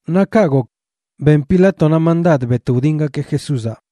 Naꞌ kaꞌ gok ben Pilátonaꞌ mandad bet wdingakeꞌ Jesúzaꞌ.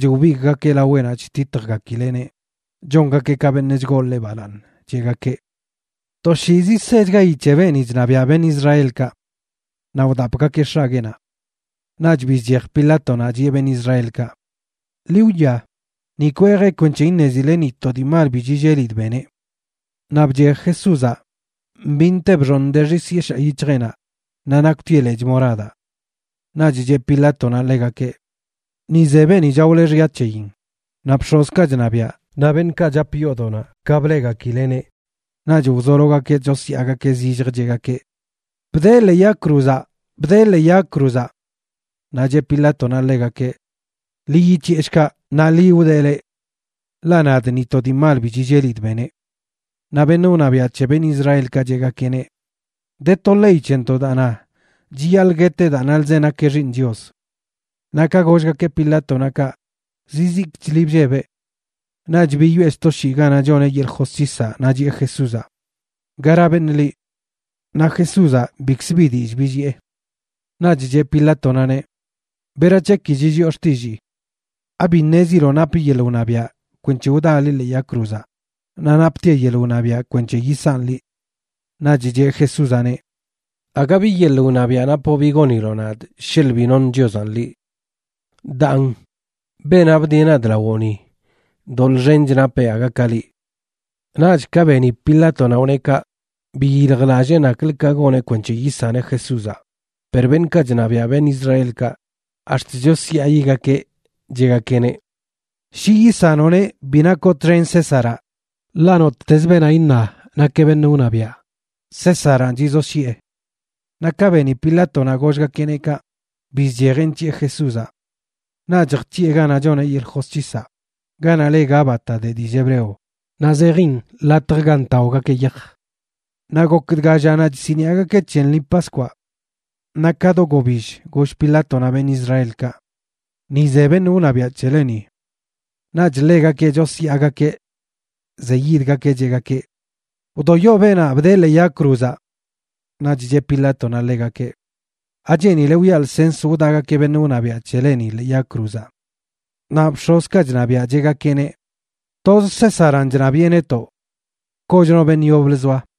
Naꞌch wbigꞌgakeꞌ laweꞌnaꞌ chtitjgakileꞌneꞌ, chongakeꞌ ka beṉꞌ chgoo ḻeꞌ balaaṉ, cheꞌgakeꞌ: ―¡Toshiizi sechgayi c̱he beeni chṉabiaꞌ beṉꞌ Israelkaꞌ! Naꞌ wdapgakeꞌ x̱agueenaꞌ. Naꞌch bizchej Pilátonaꞌ, chiꞌe beṉꞌ Israelkaꞌ: ―Ḻi wwia, ni kwejee kwenc̱he iṉezile ni to dii mal bi chillelidꞌ beneꞌ. Naꞌ bchej Jesúzaꞌ mbinte bxooṉ de xis yeshaa yic̱hjeꞌnaꞌ naꞌ nakwtieꞌ lechꞌ moradaꞌ. Naꞌch cheꞌ Pilátonaꞌ ḻegakeꞌ: ―Ni ze beeni chaole xya c̱heyin. Naꞌ bx̱ozkaꞌ chṉabiaꞌ naꞌ beṉꞌkaꞌ chap yoodoꞌnaꞌ ka bleꞌgakileꞌneꞌ, naꞌch wzologakeꞌ chosyaagakeꞌ zillj, cheꞌgakeꞌ: ―¡Bdee ḻee yag cruzaꞌ! ¡Bdee ḻee yag cruzaꞌ! Naꞌ cheꞌ Pilátonaꞌ ḻegakeꞌ: ―Ḻi yic̱hiꞌe, shkaꞌ. Naꞌ ḻi wdee, leꞌ. Ḻaꞌ nadꞌ, ni to dii mal bi chillelidꞌ beneꞌ. Naꞌ beṉꞌ wṉabiaꞌ c̱he beṉꞌ Israelkaꞌ cheꞌgakeꞌneꞌ: ―De to ley c̱hentoꞌ daa na chiyaḻꞌ gueteꞌ daa nalzeꞌ nakeꞌ Xiiṉ Chios. Naꞌ ka gollgakeꞌ Pilátonaꞌ kaꞌ, zizikchli bllebeꞌ. Naꞌch biyoꞌe sto shii ganaꞌ choneꞌ yeḻꞌ josc̱hisaꞌ naꞌ chiꞌe Jesúzaꞌ: ―¿Gara beṉꞌ liꞌ? Naꞌ Jesúzaꞌ bikzə bi dillꞌ billiꞌe. Naꞌch cheꞌ Pilátonaꞌneꞌ: ―¿Berac̱he ki chilliꞌo xtillii? ¿Abi ṉeziloꞌ napꞌ yeḻꞌ wṉabiaꞌ kwenc̱he wdaa liꞌ ḻee yag cruzaꞌ naꞌ naptiaꞌ yeḻꞌ wṉabiaꞌ kwenc̱he yisanꞌ liꞌ? Naꞌch cheꞌ Jesúzaꞌneꞌ: ―Aga bi yeḻꞌ wṉabiaꞌ napoꞌ bi goniloꞌ nadꞌ sheḻꞌ bi noṉ Chiozaꞌn liꞌ. Daan, beenaꞌ bdieꞌ nadꞌ lawoꞌ ni, doḻꞌ xench napeꞌ aga ka liꞌ. Naꞌch ka beni Pilátonaꞌ wneꞌ kaꞌ, biyiljlallee naklə ka goneꞌ kwenc̱he yisaneꞌ Jesúzaꞌ, per beṉꞌkaꞌ chṉabiaꞌ beṉꞌ Israelkaꞌ ax̱t chosyaayigakeꞌ, cheꞌgakeꞌneꞌ: ―Shi yisanoꞌneꞌ bi nakoꞌ txen Césaraꞌ, ḻaꞌ nottez beenaꞌ iṉa nakeꞌ beṉꞌ wṉabiaꞌ, Césaranꞌ chizoshyiꞌe. Naꞌ ka beni Pilátonaꞌ gollgakeꞌneꞌ kaꞌ, bizchejeꞌ nc̱hiꞌe Jesúzaꞌ. Naꞌch jc̱hiꞌe ganaꞌ choneꞌ yeḻꞌ josc̱hisaꞌ, ganaꞌ le Gábata de dillꞌ hebreo, naꞌ zejin latj ga ntaogakeꞌ yaj. Naꞌ gok dga llanaꞌ chsiniꞌagakeꞌ c̱he lṉi Paskwaꞌ. Naꞌ ka do gobill goll Pilátonaꞌ beṉꞌ Israelkaꞌ: ―Ni ze beṉꞌ wṉabiaꞌ c̱heleni. Naꞌch ḻegakeꞌ chosyaagakeꞌ. Zeyidgakeꞌ, cheꞌgakeꞌ: ―¡Wdoyo beenaꞌ! ¡Bdee ḻee yag cruzaꞌ! Naꞌch cheꞌ Pilátonaꞌ ḻegakeꞌ: ―¿Acheenile wiꞌa lsens wdaꞌgakeꞌ beṉꞌ wṉabiaꞌ c̱heleni ḻee yag cruzaꞌ? Naꞌ bx̱ozkaꞌ chṉabiaꞌ cheꞌgakeꞌneꞌ: ―Toz Césaranꞌ chṉabiꞌe netoꞌ. Koch no beṉꞌ yoblə zoa.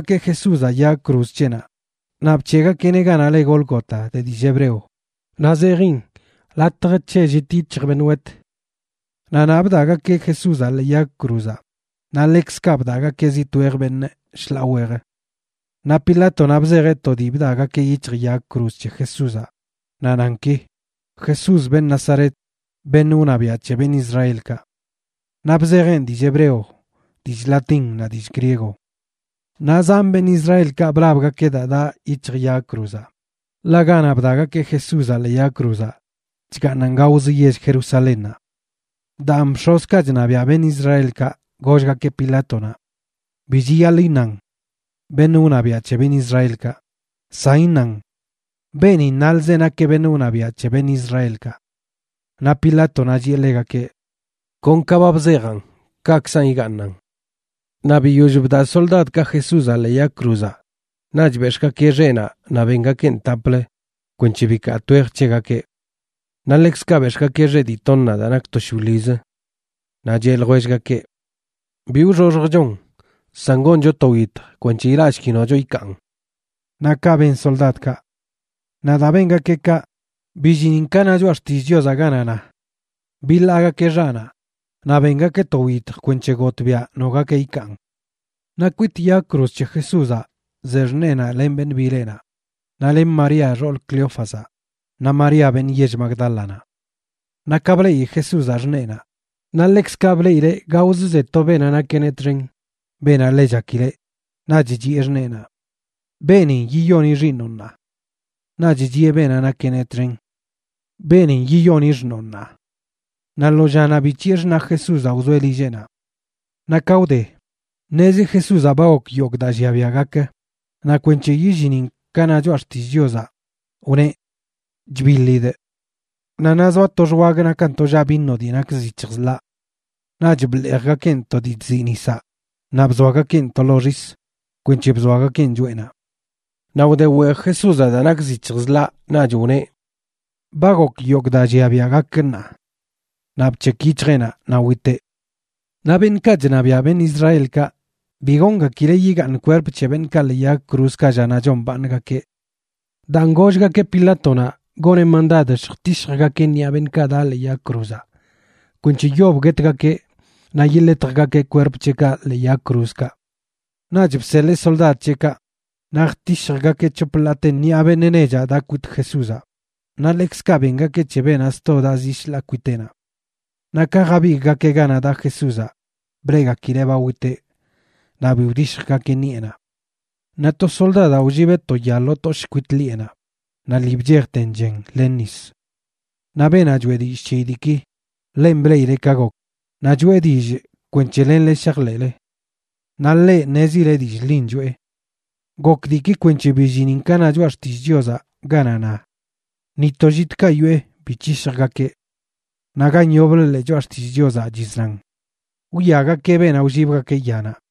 Naꞌch bwaꞌgakeꞌ Jesúzaꞌ yag cruz c̱heꞌnaꞌ, naꞌ bc̱heꞌgakeꞌneꞌ ganaꞌ le Gólgota de dillꞌ hebreo, naꞌ zejin Latj c̱he llit yic̱hj beṉꞌ wet. Naꞌ naꞌ bdaꞌgakeꞌ Jesúzaꞌ ḻee yag cruzaꞌ, naꞌ ḻekzkaꞌ bdaꞌgakeꞌ zi twej beṉꞌ shḻaa wej. Naꞌ Pilátonaꞌ bzejeꞌ to dii bdaꞌgakeꞌ yic̱hj yag cruz c̱he Jesúzaꞌ, naꞌ nan ki: “Jesús, beṉꞌ Nazaret, beṉꞌ wṉabiaꞌ c̱he beṉꞌ Israelkaꞌ.” Naꞌ bzejeꞌn dillꞌ hebreo, dillꞌ latín naꞌ dillꞌ griego. Naꞌ zan beṉꞌ Israelkaꞌ blabgakeꞌ daa daꞌ yic̱hj yag cruzaꞌ, ḻaꞌ ganaꞌ bdaꞌgakeꞌ Jesúzaꞌ ḻee yag cruzaꞌ chgaaṉan gaozə yell Jerusalénnaꞌ. Daan bx̱ozkaꞌ chṉabiaꞌ beṉꞌ Israelkaꞌ gollgakeꞌ Pilátonaꞌ: ―Bi chiyaḻꞌ iṉan “Beṉꞌ wṉabiaꞌ c̱he beṉꞌ Israelkaꞌ”; san iṉan “Beenin nalzeꞌ nakeꞌ beṉꞌ wṉabiaꞌ c̱he beṉꞌ Israelkaꞌ.” Naꞌ Pilátonaꞌ chiꞌe ḻegakeꞌ: ―Kon ka ba bzejaꞌn, kaꞌkzan igaaṉan. Naꞌ biyoll bdaꞌ soldadkaꞌ Jesúzaꞌ ḻee yag cruzaꞌ, naꞌch bex̱ꞌgakeꞌ xeꞌnaꞌ naꞌ bengakeꞌn taplə kweṉche bikaa twej c̱hegakeꞌ. Naꞌ ḻekzkaꞌ bex̱ꞌgakeꞌ xeꞌ dii toṉaꞌ daa nak to shwiḻizə. Naꞌ cheꞌ ljwellgakeꞌ: ―Bi wxoxjchon, san goncho to wyitj kwenc̱he ilaꞌshki nocho ikaan. Naꞌ kaꞌ ben soldadkaꞌ. Naꞌ daa bengakeꞌ kaꞌ, billinin ka na Choꞌa Xtillꞌ Chiozaꞌ ganaꞌ na: “Biḻaagakeꞌ xaꞌnaꞌ, naꞌ bengakeꞌ to wyitj kwenc̱he gotꞌbiaꞌ nogakeꞌ wkaan.” Naꞌ kwit yag cruz c̱he Jesúzaꞌ ze xṉeenaꞌ len beṉꞌ bileꞌnaꞌ, naꞌ len María, xool Cleófazaꞌ, naꞌ María beṉꞌ yell Magdálanaꞌ. Naꞌ ka bleꞌi Jesúzaꞌ xṉeenaꞌ, naꞌ ḻekzkaꞌ bleꞌileꞌ gaozə ze to beenaꞌ nakeꞌneꞌ txen, beenaꞌ ḻe chakileꞌ, naꞌch chiꞌe xṉeenaꞌ: ―Beenin yiyoni xiiṉoꞌ ṉaa. Naꞌch chiꞌe beenaꞌ nakeꞌneꞌ txen: ―Beenin yiyoni xṉoo ṉaa. Naꞌ lo llanaꞌ bic̱hiꞌe xṉaꞌ Jesúzaꞌ wzoeꞌ lilleꞌnaꞌ. Naꞌ ka wde, ṉezi Jesúzaꞌ ba gok yogꞌ daa llia biaꞌ gakə, naꞌ kwenc̱he yillinin ka na Choꞌa Xtillꞌ Chiozaꞌ, wneꞌ: ―Chbiḻidꞌ. Naꞌ naꞌ zoa to xwag nakan tollaꞌ vino dii nak zic̱hj zḻaꞌ. Naꞌch bḻeejgakeꞌn to dii chziꞌ nisaꞌ naꞌ bzoagakeꞌn to lo xisa kwenc̱he bzoagakeꞌn choꞌenaꞌ. Naꞌ wde weej Jesúzaꞌ daa nak zic̱hj zḻaꞌ, naꞌch wneꞌ: ―Ba gok yogꞌ daa llia biaꞌ gak ṉaa. Naꞌ bc̱hekꞌ yic̱hjeꞌnaꞌ, naꞌ witeꞌ. Naꞌ beṉꞌkaꞌ chṉabiaꞌ beṉꞌ Israelkaꞌ bi goongakileꞌ yigaaṉ kwerp c̱he beṉꞌkaꞌ ḻee yag cruzkaꞌ llanaꞌ chombaaṉgakeꞌ. Daan gollgakeꞌ Pilátonaꞌ goneꞌ mandad lljtishjgakeꞌ ṉiꞌa beṉꞌkaꞌ daꞌ ḻee yag cruzaꞌ kwenc̱he yob guetgakeꞌ naꞌ yiḻetjgakeꞌ kwerp c̱heꞌkaꞌ ḻee yag cruzkaꞌ. Naꞌch bseḻee soldad c̱heꞌkaꞌ, naꞌ jtishjgakeꞌ c̱hop ḻaate ṉiꞌa beṉꞌ nechaꞌ daꞌ kwit Jesúzaꞌ, naꞌ ḻekzkaꞌ bengakeꞌ c̱he beenaꞌ sto daꞌ zi shḻaa kwiteꞌnaꞌ. Naꞌ ka jabigꞌgakeꞌ ganaꞌ daꞌ Jesúzaꞌ bleꞌgakileꞌ ba witeꞌ, naꞌ bi wdishjgakeꞌ ṉiꞌenaꞌ. Naꞌ to soldadaꞌ wllibeꞌ to ya lo toshꞌ kwit ḻiꞌenaꞌ naꞌ lii bchejten chen len nis. Naꞌ beenaꞌ choeꞌ dillꞌ c̱heyi diiki, ḻenꞌ bleꞌileꞌ ka gok, naꞌ choꞌe dillꞌ kwenc̱he lenle shajḻeꞌle. Naꞌ ḻeꞌ ṉezileꞌ dillꞌ ḻin choꞌe. Gok diiki kwenc̱he billinin ka na Choꞌa Xtillꞌ Chiozaꞌ ganaꞌ na: “Ni to llitkaꞌ yoꞌe bi c̱hishjgakeꞌ.” Naꞌ gan yoblə ḻee Choꞌa Xtillꞌ Chiozaꞌ chiznan: “Wwiagakeꞌ beenaꞌ wllibgakeꞌ yanaꞌ.”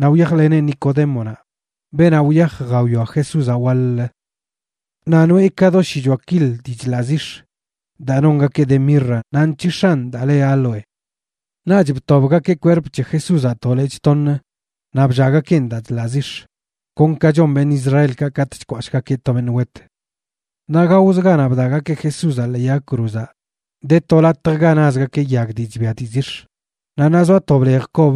Naꞌ wyajleneꞌ Nicodémonaꞌ, beenaꞌ wyaj jawia Jesúzaꞌ waḻ-lə. Naꞌ noꞌe ka do shichoa kil dii chḻaꞌ zix̱ daa nongakeꞌ de mirra naꞌ nc̱hix̱an daa le áloe. Naꞌch btobgakeꞌ kwerp c̱he Jesúzaꞌ to lechꞌ toṉ naꞌ bllaꞌgakeꞌn daa chḻaꞌ zix̱, kon ka chon beṉꞌ Israelkaꞌ katꞌ chkwashꞌgakeꞌ to beṉꞌ wet. Naꞌ gaozə ganaꞌ bdaꞌgakeꞌ Jesúzaꞌ ḻee yag cruzaꞌ de to latj ga nazgakeꞌ yag dii chbia dii zix̱, naꞌ naꞌ zoa to blej kob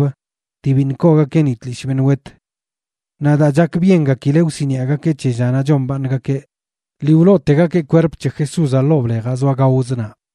dii biṉꞌ koogakeꞌ ni tlishꞌ beṉꞌ wet. Naꞌ daa chakbyengakileꞌ wsiniꞌagakeꞌ c̱he llanaꞌ chombaaṉgakeꞌ, lii wlootegakeꞌ kwerp c̱he Jesúzaꞌ ḻoo blejaꞌ zoa gaozə naꞌ.